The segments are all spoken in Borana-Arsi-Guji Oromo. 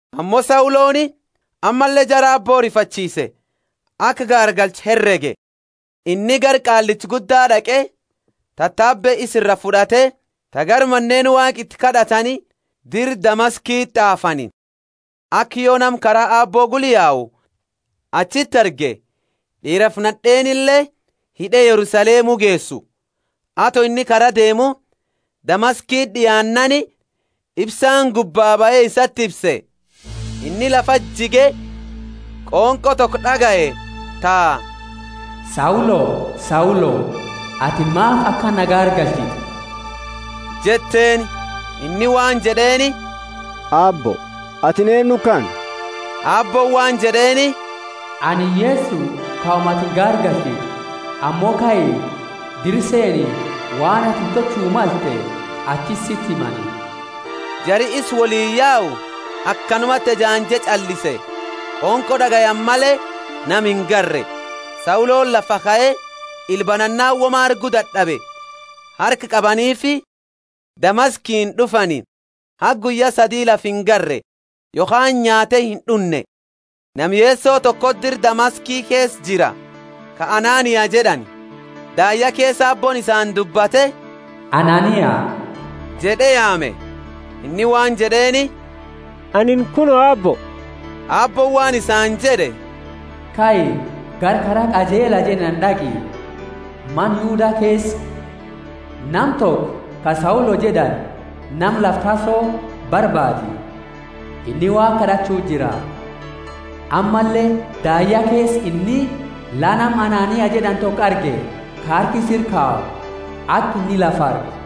Ammo Sauloni ammalle jara Aabbo rifachiise, aka gaargalchu herege. Inni gara Qaallicha Gudda d'aqe, tatabe isa iraa fud'ate, ta gara maneeni Waaqa iti kad'atani dira Damaskiti t'aafani, aka yo nama Kara Aabbo gula yau achiti arge, d'iirafi nad'eenile, hid'e Yerusalemu geesu. Ato inni kara deemu, Damaskiti d'iaannaani, ifsaani gubbaa bahe isati ifse. Inni lafati jige, qonqo toko d'agaye ta, Saulo, Saulo, atini maafi akana na gaargalchita? jetteeni. Inni waan jed'eeni, Aabbo, atini eennu kana? Aabbooni waan jed'eeni, Anini Yeso kauma atini gaargalchitu. Ammo kai, dira seeni, waan atini tolchu malte achiti siti himani. Jari isa woliini yau akanumati ejaanje ch'allise, qonqo d'agayani male nama ingarre. Sauloni lafaa kae, ila banannaani woma argu dad'abe, harka qabaniifi Damaskiini d'ufani. Haga guyya sadi lafa ingarre, yokhaani nyaate ind'unne. Nama Yeso tokoti dira Damaski keesa jira, ka Anania jed'ani. Daayya keesa Aabbooni isaani dubbate, Anania jed'e yaame. Inni waan jed'eeni, Anini kuno, Aabbo. Aabbooni waan isaani jed'e, Kai, gara Kara Qajeela jed'ani d'aqi, mana Yuda keesa, nama toko ka Saulo jed'ani, nama lafa Tarso, barbaadi. Inni Waaqa kad'achu jira. Ammalle daayya keesa inni la nama Anania jed'ani toko arge, ka harka isa ira kayu, aka inni lafa argu.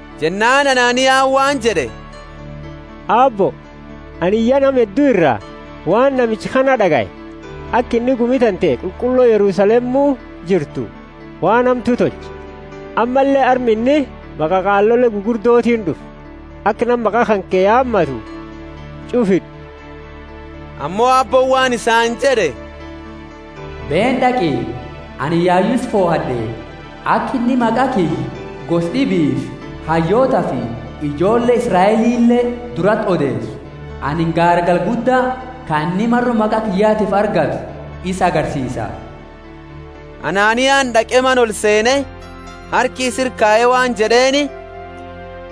Jennaani Ananiani waan jed'e, Aabbo, anini ya nama heddu ira waan namicha kana d'agaye, aka inni gumi tante qulqullo Yerusalemu jirtu waan hamtu tolche. Ammalle arma inni maqa qaalole gugurdotiini d'ufe, aka nama maqa kanke yaamatu ch'ufa hid'u. Ammo Aabbooni waan isaani jed'e, Beeni d'aqi, anini yayu isa fohad'e, aka inni maqa kiyya gosa d'ibiifi hayyootafi ijoolle Israelile durati odeesu. Anini gaargala gudda, ka inni maro maqa kiyyatiifi argatu, isa agarsiisa. Ananiani d'aqe mana olseene, harka isa ira kaye waan jed'eeni,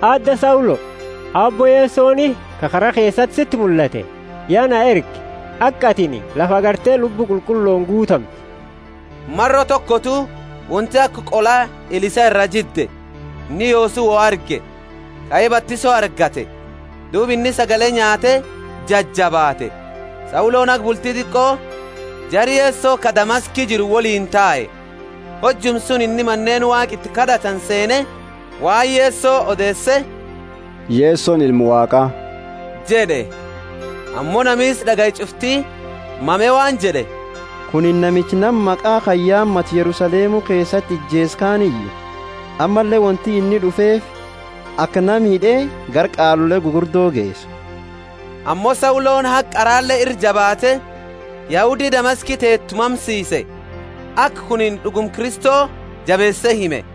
Aadda Saulo, Aabbo Yesoni, ka kara keesati siti mullate, ya na erge, aka atini lafa agarte Lubbu Qulqullooni guutamtu. Maro tokotu wonti aka qola ila isaa iraa jidde, inni yoosu wo arge, kae batiso argate. Duuba inni sagale nyaate jajabaate. Sauloni Damaski keesati hasaa Sauloni haga bulti diqo jara Yeso ka Damaski jiru, woliini tae. Hojuma suni inni maneeni Waaqa iti kad'atani seene waan Yeso odeese, Yesoni Ilma Waaqa jed'e. Ammo nami isa d'agaye ch'ufti mame waan jed'e, Kunini namicha nama maqa kana yaamatu, Yerusalemu keesati, ijeese kaaniyu? Ammalle wonti inni d'ufeefi, aka nama hid'e gara qaalole gugurdo geesu. Ammo Sauloni haga qara ira jabaate, Yahudi Damaski teetu mamsiise, aka kunini d'uguma Kristo jabeese hime.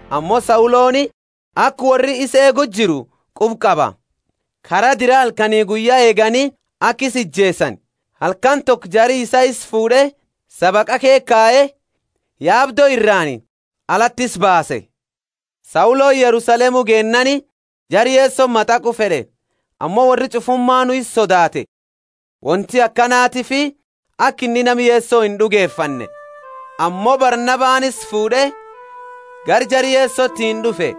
Ammo Sauloni, aka worri isa eegu jiru, quba qaba. Kara dira halkani guyya eegani, aka isa ijeesani. Halkani toko jari isaa isa fuud'e sabaqa ke kaye, yaabdo iraani alati isa baase. Sauloni Yerusalemu geennaani jara Yesoti mataqu fed'e, ammo worri ch'ufumaanu isa sodaate, wonti akanatiifi aka inni nama Yeso ind'ugefanne. Ammo Barnabani isa fuud'e gara jara Yesotiini d'ufe.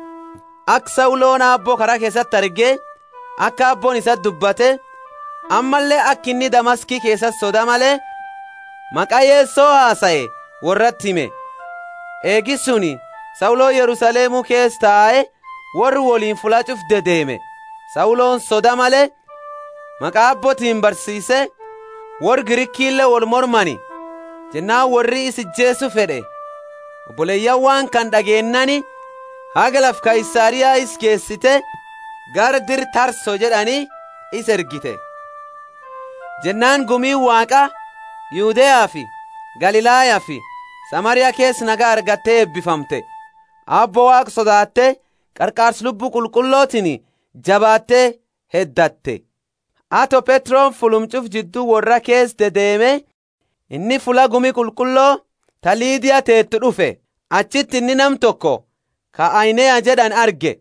Aka Sauloni Aabbo kara keesati arge, aka Aabbooni isaani dubbate, ammalle aka inni Damaski keesati soda male maqa Yeso hasae worrati hime. Eegi suni Sauloni Yerusalemu keesa tae worra woliini fulla ch'ufa dedeeme. Sauloni soda male maqa Aabbootiini barsiise, worra Grikile wolmormani, jennaani worri isa ijeesu fed'e. Oboleyaani waan kana d'ageennaani haga lafa Kaisaria isa geesite, gara dira Tarso jed'ani isa ergite. Jennaani gumiini Waaqa Yudeafi Galilayafi Samaria keesa nagaya argate eebifamte, Aabbo Waaqa sodaate qarqaarsa Lubbu Qulqullotiini jabaatte heddatte. Ato Petroni fulluma ch'ufa jiddu worra keesa dedeemu, inni fulla gumi qulqullo, ta Lidia teetu, d'ufe. Achiti inni nama toko ka Ainea jed'ani arge,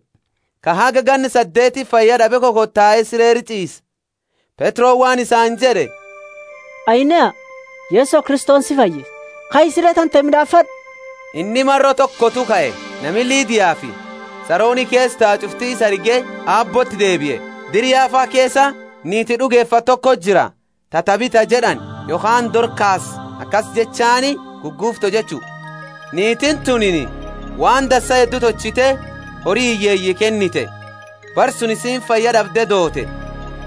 ka haga ganna saddeeti fayyad'abe kokotae sire ira ch'iise. Petroni waan isaani jed'e, Ainea, Yeso Kristoni si fayyisa, kai sire tante mid'aafad'u. Inni maro tokotu kae. Nami Lidiafi Saroni keesa tau ch'ufti isa arge Aabbooti dedebie. Dira Yafa keesa, niiti d'ugefatte tokoti jira, ta Tabitha jed'ani, yokhaani Dorkasi, akasi jechaani Guguufto jechu. Niitiini tunini waan dansa heddu tolchite hori hiyyeeyi kennite. Bara suni isiini fayya d'abde doote.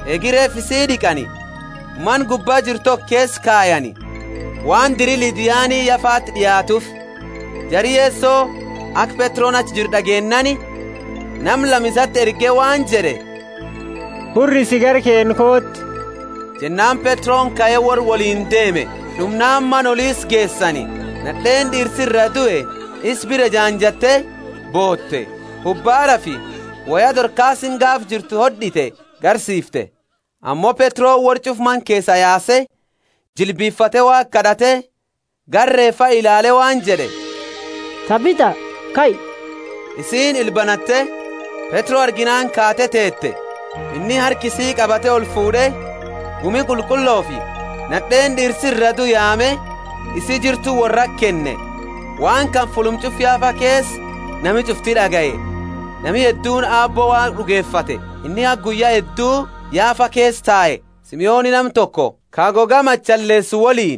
Eegi reefa isii d'iqani, mana gubba jiru toko keesa kayani. Waan diri Lidiani Yafati d'iaattuufi, jari Yeso aka Petroni achi jiru d'ageennaani, nama lama isati erge waan jed'e, Hurrisi gara keenna kooti. Jennaani Petroni kae worra woliini deeme. D'umnaani mana oli isa geesani. Nad'eeni d'iirsi iraa due isa bira ejaanjatte boote, ubaarafi woya Dorkasini gaafa jirtu hod'ite garsiifte. Ammo Petroni worra ch'ufa mana keesaa yaase, jilbifate Waaqa kad'ate, gara reefa ilaale waan jed'e, Tabitha, kai! Isiini ila banatte, Petro arginaani kaate teete. Inni harka isii qabate olfuud'e, gumi qulqullofi nad'eeni d'iirsi iraa due yaame, isi jirtu worrati kenne. Waan kana fulluma ch'ufa Yafa keesa nami ch'ufti d'agaye, nami hedduuni Aabbo Waaqa d'ugefate. Inni haga guyya heddu Yafa keesa tae, Simoni nama toko ka goga machaleesu woliini.